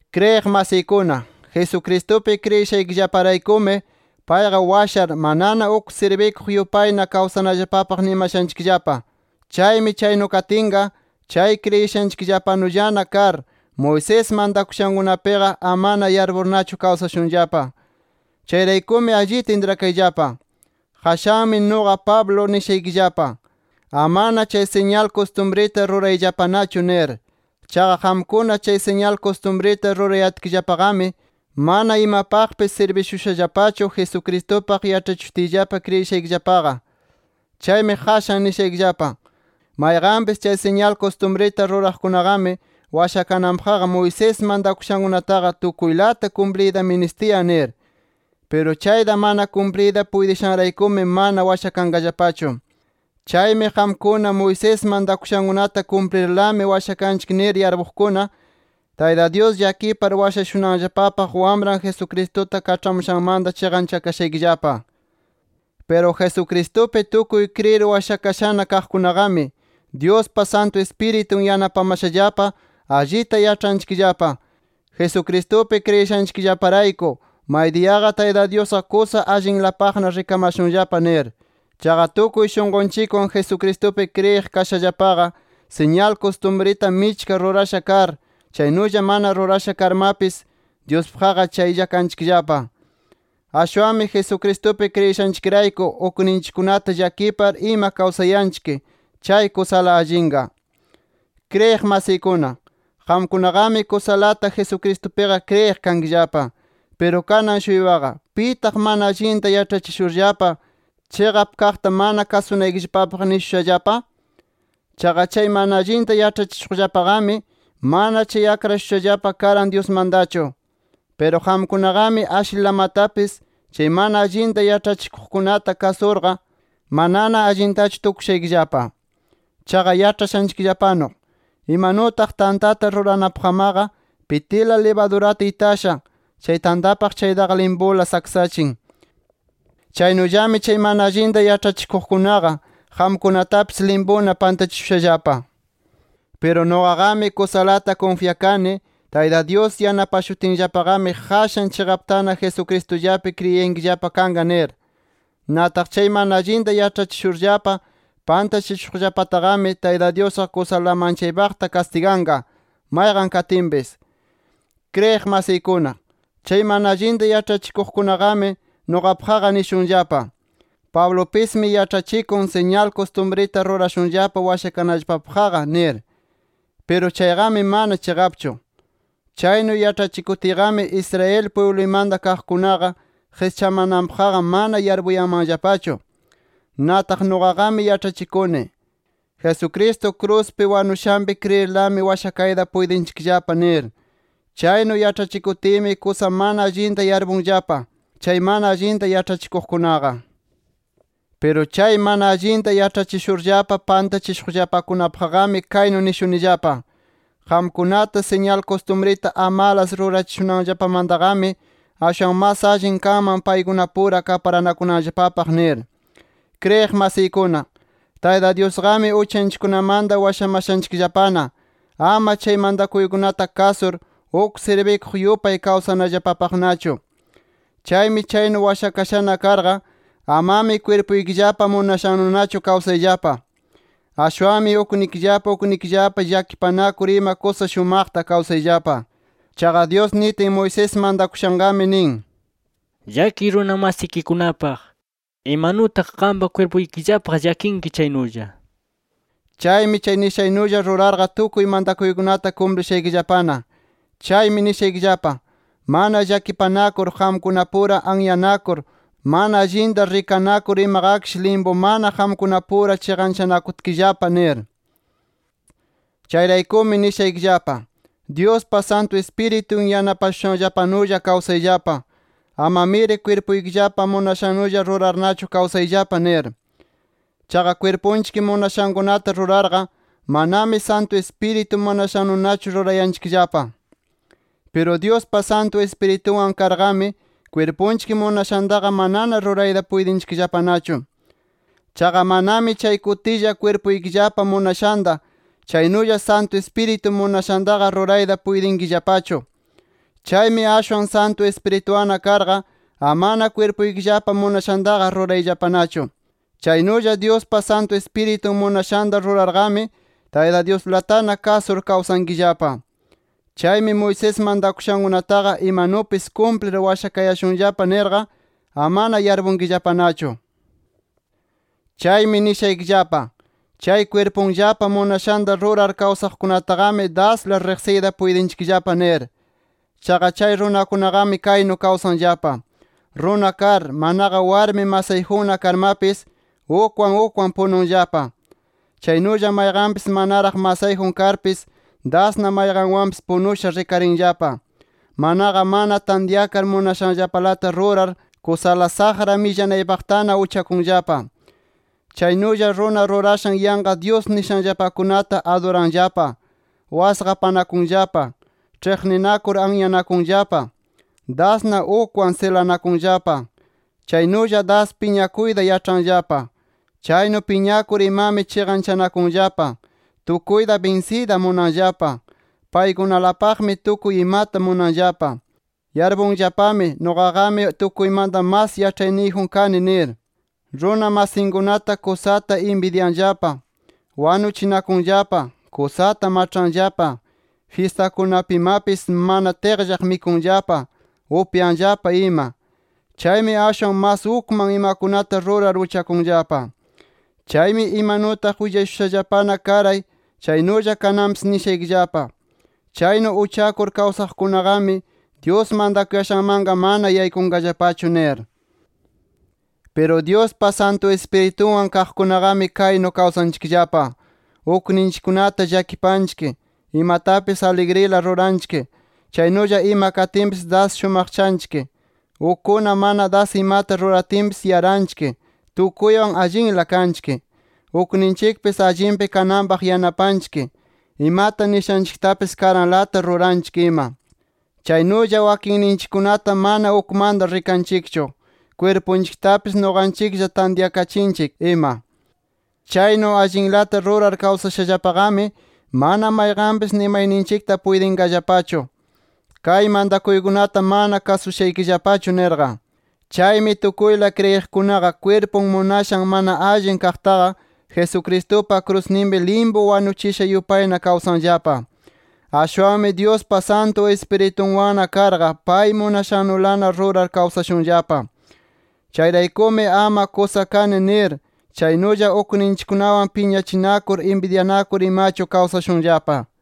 Kriyiq masiykuna, Jesucristupi kriyishanchikllaparaykumi payqa washar, manana uk sirbikuq yupayna kawsanallapapaq nimashanchikllapa. Chaymi chaynu katinqa, chay kriyishanchikllapanullana kar, Moisés mantakushankunapiqa amana yarpurnachu kawsashunllapa. Chayraykumi allita intrakayllapa. Qashanmi nuqa Pablo nishaykillapa: Amana chay siñal kustumrita rurayllapanachu nir. Chaqa qamkuna chay siñal kustumrita rurayatkillapaqami, mana imapaqpis sirbishushallapachu, Jesucristupaq yaĉhachishutiyllapa kriyishaykillapaqa. Chaymi qashan nishaykillapa: Mayqanpis chay siñal kustumrita ruraqkunaqami, washakananpaqqa Moisés mantakushankunataqa tukuylata kumpliyta ministiyan nir. Piru chayta mana kumpliyta puytishanraykumi mana washakanqallapachu. Chaymi qamkuna, Moisés mantakushankunata kumplirlami washakanchik nir yarpuqkuna, Tayta Dyus llakipar washashunanllapapaq Wamran Jesucristuta kaĉhamushanmanta chiqanchakashaykillapa. Piru Jesucristupi tukuy kriyir washakashana kaqkunaqami, Dyuspa Santu Ispiritun yanapamashallapa, allita yaĉhanchikllapa: Jesucristupi kriyishanchikllaparayku, maydiyaqa Tayta Dyusqa kusa allinlapaqna rikamashunllapa nir. Chaqa tukuy shunqunchikwan Jesucristupi kriyiq kashallapaqa, siñal kustumrita michka rurasha kar, chaynulla mana rurasha karmapis, Dyuspaqqa chaylla kanchikllapa. Ashwanmi Jesucristupi kriyishanchikrayku, ukninchikkunata llakipar ima kawsayanchik, chay kusala allinqa. Kriyiq masiykuna, qamkunaqami kusalata Jesucristupiqa kriyiq kankillapa. Piru kanan-shuypaqa, ¿pitaq mana allinta yaĉhachishurllapa, chiqap kaqta mana kasunaykillapapaq nishushallapa? Chaqa chay mana allinta yaĉhachishuqllapaqami, mana chay akrashushallapa karan Dyusmantachu. Piru qamkunaqami ashlilamatapis chay mana allinta yaĉhachikuqkunata kasurqa, manana allintachu tukushaykillapa. Chaqa yaĉhashanchikllapanu, imanutaq tantata ruranapaqmaqa pitila libadurata itasha, chay tantapaq chaytaqa limpula saksachin. Chaynullami chay mana allinta yaĉhachishuqkunaqa qamkunatapis limpuna pantachishushallapa. Piru nuqaqami kusalata kunfyakani, Tayta Dyus yanapashutinllapaqami, qashan chiqaptana Jesucristullapi kriyiyankillapa kanqa, nir. Nataq chay mana allinta yaĉhachishurllapa pantachishuqllapataqami, Tayta Dyusqa kusala manchaypaqta kastiganqa, mayqan katinpis. Kriyiq masiykuna, chay mana allinta yaĉhachikuqkunaqami nuqapaqqa nishunllapa: “Pablupismi yaĉhachikun, siñal kustumrita rurashunllapa washakanallapapaqqa” nir. Piru chayqami mana chiqapchu. Chaynu yaĉhachikutiyqami, Israel pwibluymanta kaqkunaqa, qischamananpaqqa mana yarpuyanmanllapachu. Nataq nuqaqami yaĉhachikuni: “Jesucristo kruspi wanushanpi kriyirlami, washakayta puytinchikllapa” nir. Chaynu yaĉhachikutiymi kusa mana allinta yarpunllapa, chay mana allinta yaĉhachikuqkunaqa. Piru chay mana allinta yaĉhachishurllapa pantachishuqllapakunapaqqami kaynu nishunillapa: Qamkunata siñal kustumrita amalas rurachishunanllapamantaqami, ashwan mas allin kanman paykunapura kaparanakunanllapapaq nir. Kriyiq masiykuna, Tayta Dyusqami uchanchikkunamanta washamashanchikllapana, ama chay mantakuykunata kasur, uk sirbikuq yupay kawsanallapapaqnachu. Chaymi chaynu washakashana karqa, amami kwirpuykillapa munashannunachu kawsayllapa. Ashwanmi uknikillapa uknikillapa llakipanakur ima kusa shumaqta kawsayllapa. Chaqa Dyus nitin, Moisés mantakushanqami nin: “Llakiy runa masikikunapaq, imanutaq qampa kwirpuykillapaq llakinki chaynulla” nir. Chaymi chay nishannulla rurarqa tukuy mantakuykunata kumplishaykillapana. Chaymi nishaykillapa: Mana llakipanakur, qamkunapura anyanakur, mana allinta rikanakur imaqakish limpumana qamkunapura chinqachanakutkillapa nir. Chayraykumi nishaykillapa: Dyuspa Santu Ispiritun yanapashushanllapanulla kawsayllapa. Amamiri kwirpuykillapa munashannulla rurarnachu kawsayllapa nir. Chaqa kwirpunchik munashankunata rurarqa, manami Santu Ispiritu munashannunachu rurayanchikllapa. Piru Dyuspa Santu Ispiritunwan karqami, kwirpunchik munashantaqa manana rurayta puytinchikllapanachu. Chaqa manami chay kutilla kwirpuykillapa munashanta, chaynulla Santu Ispiritu munashantaqa rurayta puytinkillapachu. Chaymi ashwan Santu Ispirituwanna karqa, amana kwirpuykillapa munashantaqa rurayllapanachu. Chaynulla Dyuspa Santu Ispiritun munashanta rurarqami, Tayta Dyuslatana kasur kawsankillapa. Chaymi Moisés mantakushankunataqa imanupis kumplir washakayashunllapa nirqa amana yarpunkillapanachu. Chaymi nishaykillapa: Chay kwirpunllapa munashanta rurar kawsaqkunataqami dasla riqsiyta puytinchikllapa nir. Chaqa chay runakunaqami kaynu kawsanllapa: Runa kar, manaqa warmi masayjunna karmapis ukwan ukwan pununllapa, chaynulla mayqanpis manaraq masayjun karpis dasna mayqanwanpis punusha rikarinllapa, manaqa mana tantyakar munashanllapalata rurar kusala saqra millanaypaqtana uchakunllapa. Chaynulla runa rurashan yanqa dyus nishanllapakunata aduranllapa. Wasqapanakunllapa. Ĉhiqninakur anyanakunllapa. Dasna ukwan silanakunllapa. Chaynulla das piñakuyta yaĉhanllapa. Chaynu piñakur imami chiqanchanakunllapa. Tukuyta binsiyta munanllapa. Paykunalapaqmi tukuy imata munanllapa. Yarpunllapami, nuqaqami tukuymanta mas yaĉhayniyjun kani, nir. Runa masinkunata kusata inbidyanllapa. Wanuchinakunllapa. Kusata maĉhanllapa. Fyistakunapimapis mana tiqllaq mikunllapa, upyanllapa ima. Chaymi ashwan mas ukman imakunata rurar uchakunllapa. Chaymi imanutaq willashushallapana karay chaynulla kananpis nishaykillapa: Chaynu uchakur kawsaqkunaqami, Dyus mantakuyashanmanqa mana yaykunqallapachu nir. Piru Dyuspa Santu Ispiritunwan kaqkunaqami kaynu kawsanchikllapa: Ukninchikkunata llakipanchik, imatapis aligrila ruranchik, chaynulla ima katinpis das shumaqchanchik, ukkuna mana das imata ruratinpis yaranchik, tukuywan allinla kanchik, ukninchikpis allinpi kananpaq yanapanchik, imata nishanchiktapis karanlata ruranchik ima. Chaynulla wakinninchikkunata mana ukmanta rikanchikchu, kwirpunchiktapis nuqanchiklla tantyakachinchik ima. Chaynu allinlata rurar kawsashallapaqami, mana mayqanpis nimayninchikta puytinqallapachu: “Kay mantakuykunata mana kasushaykillapachu” nirqa. Chaymi tukuyla kriyiqkunaqa, kwirpun munashan mana allin kaqtaqa, Jesucristupa krusninpi limpu wanuchisha yupayna kawsanllapa. Ashwanmi Dyuspa Santu Ispiritunwanna karqa, pay munashannulana rurar kawsashunllapa. Chayraykumi ama kusa kani nir, chaynulla ukninchikkunawan piñachinakur, inbidyanakur imachu kawsashunllapa.